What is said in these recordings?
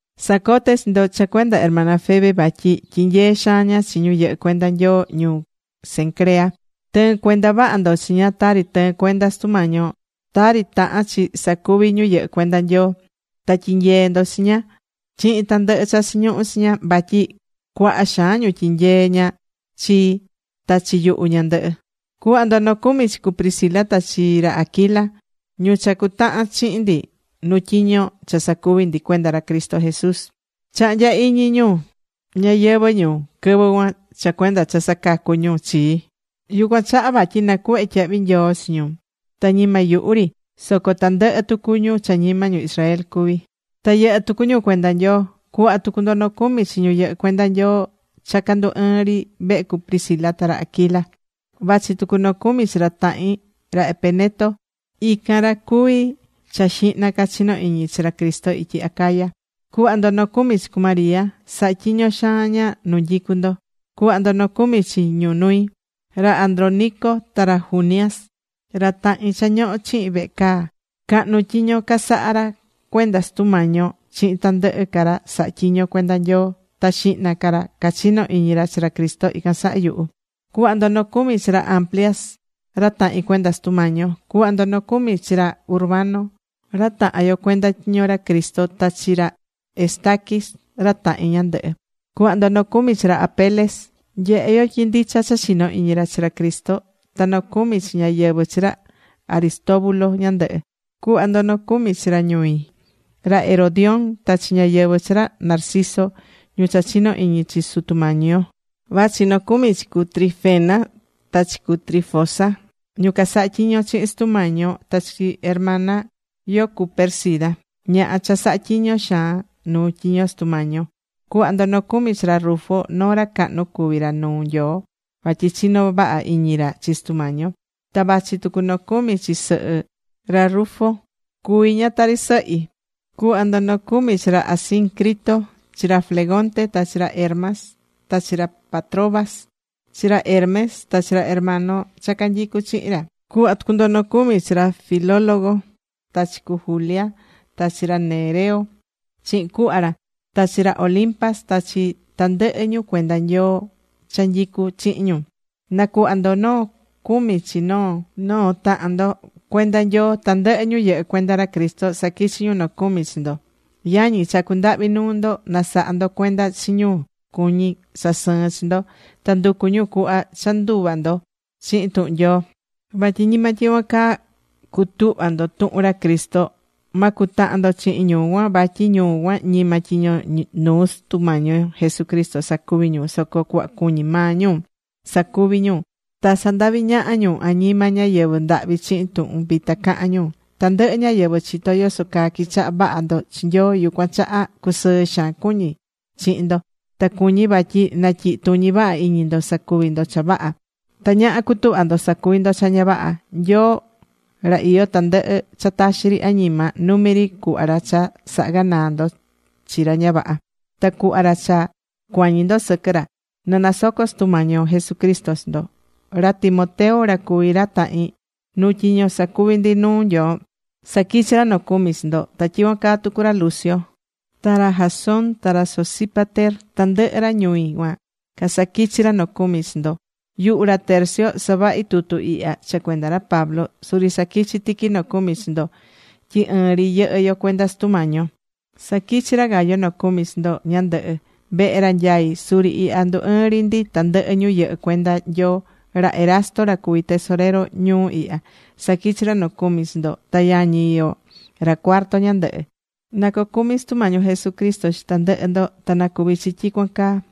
Sacoté chi ndo cha cuenda hermana Febe vatyi tyinyée xaan ña chi ñu yɨhɨ́ cuenda Nyoo ñuu Cencrea. Tɨ̱ɨn cuenda vaha ndo chi ña tari tɨɨ̱n cuenda Sutu Mañi yo, tari tahán chi sacuvi ñu yɨhɨ́ cuenda Nyoo. Ta tyi̱nyee ndo chi ña chihin tandɨhɨ cha chiñuhu chi ña, vatyi cuaha xaan ñu tyinyeé ña chi, ta chi yuhu ñandɨhɨ. Cu̱hva ndo nocumi chi cu Priscila ta chi ra Aquila ñu cha cutahan chihin ndi nu tyiño cha sacuví ndi cuenda ra Cristo Jesús. Chahnya̱ iñi ñu ñayɨvɨ̱ ñu quɨvɨ cuan cha cuenda cha sacacu̱ ñu chii, yucuan chaha vatyi nacuhvé tyahvi nyoo chi ñu. Ta ñima yuhu ri, soco tandɨhɨ tucu ñu cha ñima ñu Israel cuvi, ta yɨhɨ́ tucu ñu cuenda Nyoo. Cu̱hva tucu ndo nocumi chi ñu yɨhɨ́ cuenda Nyoo cha candú ɨɨn ri vehe cu Priscila ta ra Aquila. Vachi tucu nocumi chi ra tahin, ra Epeneto. Ican ra cuví ra cha xihna ca chino iñi chi ra Cristo ityi Acaya. Cu̱hva ndo nocumi chi cu María. Sahá tyiño xaan ña nu nyicú ndo. Cu̱hva ndo nocumi chi ñu ñui, ra Andrónico ta ra Junias, ra tahin cha ñoho̱ chihin vehe caa. Cahnu tyiño casahá ra cuenda Sutu Mañi yo chihin tandɨhɨ ca ra sahá tyiño cuenda Nyoo. Ta xihna ca ra cachino iñi chi ra Cristo ican saha yuhu. Cu̱hva ndo nocumi chi ra Amplias ra tahin cuenda Sutu Mañi yo. Cu̱hva ndo nocumi chi ra Urbano, ra tahan yo cuenda tyiño ra Cristo Jesús, ta chi ra Estaquis ra tahin ñandɨhɨ. Cu̱hva ndo nocumi chi ra Apeles. Nyehé yo tyi ndicha cha chinó iñi ra chi ra Cristo. Ta nocumi chi ñáyɨvɨ chi ra Aristóbulo ñandɨhɨ. Cu̱hva ndo nocumi chi ra ñui, ra Herodión, ta chi ñáyɨvɨ chi ra Narciso ñu cha chinó iñi chi Sutu Mañi yo. Vachi nocumi chi cu Trifena ta chi cu Trifosa, ñu casahá tyiño chihin Sutu Mañi yo. Ta chi hermana yo cu Pérsida, ñaha cha sahá tyiño xaan nu tyiño Sutu Mañi yo. Cu̱hva ndo nocumi chi ra Rufo, noo ra cahnu cuví ra nuu Nyoo vatyi chinó vaha iñi ra chi Sutu Mañi yo. Ta vachi tucu noo cumi chi sɨhɨ ra Rufo. Cuví ña tari sɨhi. Cu̱hva ndo nocumi chi ra Asíncrito, chi ra Flegonte ta chi ra Hermas, ta chi ra Patrobas, chi ra Hermes ta chi ra hermano cha canyicú chihin ra. Cu̱hva tucu ndo nocumi chi ra Filólogo ta chi cu Julia ta chi ra Nereo chihin cuhva ra, ta chi ra Olimpas ta chi tandɨhɨ ñu cuenda Nyoo cha nyicú chihin ñu. Na̱cuhva ndo noo cumi chi noo noo tahan ndo cuenda Nyoo. Tandɨhɨ ñu yɨhɨ́ cuenda ra Cristo saquichi̱ ñu nocumi chi ndo. Yañi, chacú ndahvi nuu ndo, na saha ndo cuenda chi ñu cuñí sasɨɨn chi ndo, ta nducú ñu cuhva cha nduva ndo chihin tuhun Nyoo, vatyi ñima tyicuan caa cutuhva̱ ndo tuhun ra Cristo. Ma cutahan ndo chihin ñu cuan. Vatyi ñu cuan ñima tyiño nuu Sutu Mañi yo Jesucristo sacuví ñu, soco cuhva cuñí maa ñu sacuví ñu. Ta sandahví ñaha ñu añima ñáyɨvɨ ndahvi chihin tuhun vita cahán ñu. Tandɨhɨ ñáyɨvɨ chitó yoso caa quichahá vaha ndo chi Nyoo. Yucuan chaha cusɨɨ xaan cuñí chihin ndo, ta cuñí vatyi natyihi tuñi vaha iñi ndo sacuvi ndo cha vaha. Ta ñaha cutuhva ndo sacuvi ndo cha ña vaha. Nyoo ra iyó tandɨhɨ cha taxi ri añima, numi ri cuhva ra cha saha ganaa ndo chi ra ña vaha, ta cuhva ra cha cuañi ndo sɨquɨ ra. Na nasoco Sutu Mañi yo Jesucristo chi ndo. Ra Timoteo ra cuví ra tahin nuu tyiño sacuví ndi nuu Nyoo, saquichí ra nocumi chi ndo. Ta tyicuan caa tucu ra Lucio, ta ra Jasón, ta ra Sosípater, tandɨhɨ ra ñui cuan casaquichi̱ ra nocumi chi ndo. Yuhu ra Tercio savahi tutu ihya cha cuenda ra Pablo, suri saquichí tiqui nocumi chi ndo tyi ɨɨn ri yɨhɨ́ yo cuenda Sutu Mañi yo. Saquichí ra Gayo nocumi chi ndo ñandɨhɨ. Vehe ra nyaí suri ihya ndú ɨɨn ri ndi tandɨhɨ ñu yɨhɨ́ cuenda Nyoo. Ra Erasto ra cuví tesoreru ñuu ihya, saquichí ra nocumi chi ndo, ta yañi yo ra Cuarto ñandɨhɨ. Na cocumi Sutu Mañi yo Jesucristo chi tandɨhɨ ndo. Ta na cuvi chi tyicuan caa.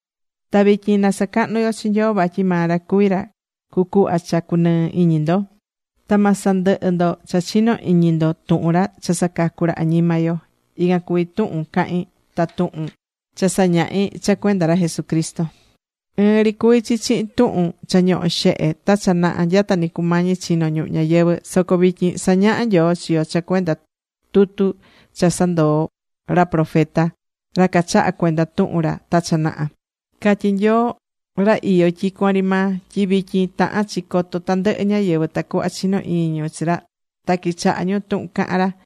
Ta vityin na sacahnu yo chi Nyoo, vatyi maa ra cuví ra cucuhva cha cunɨɨ iñi ndo, ta ma sandɨhɨ ndo cha chinó iñi ndo tuhun ra cha sacacú ra añima yo. Ican cuví tuhun cahín ta tuhun cha sañahí cha cuenda ra Jesucristo. Ɨɨn ri cuví chi chihin tuhun cha ñoho̱ xehe ta cha naha nyata ni cumañi chino̱ ñuhu ñayɨvɨ̱. Soco vityin sañahá Nyoo chi yo cha cuenda tutu cha casandoo̱ ra profeta, ra cachaha̱ cuenda tuhun ra ta cha naha. Catyí Nyoo, ra iyó tyicuan ri maa, tyi vityin tahán chi coto tandɨhɨ ñáyɨvɨ tacuhva chino iñi ñu chi ra ta quichaha ñu tuhun cahán ra.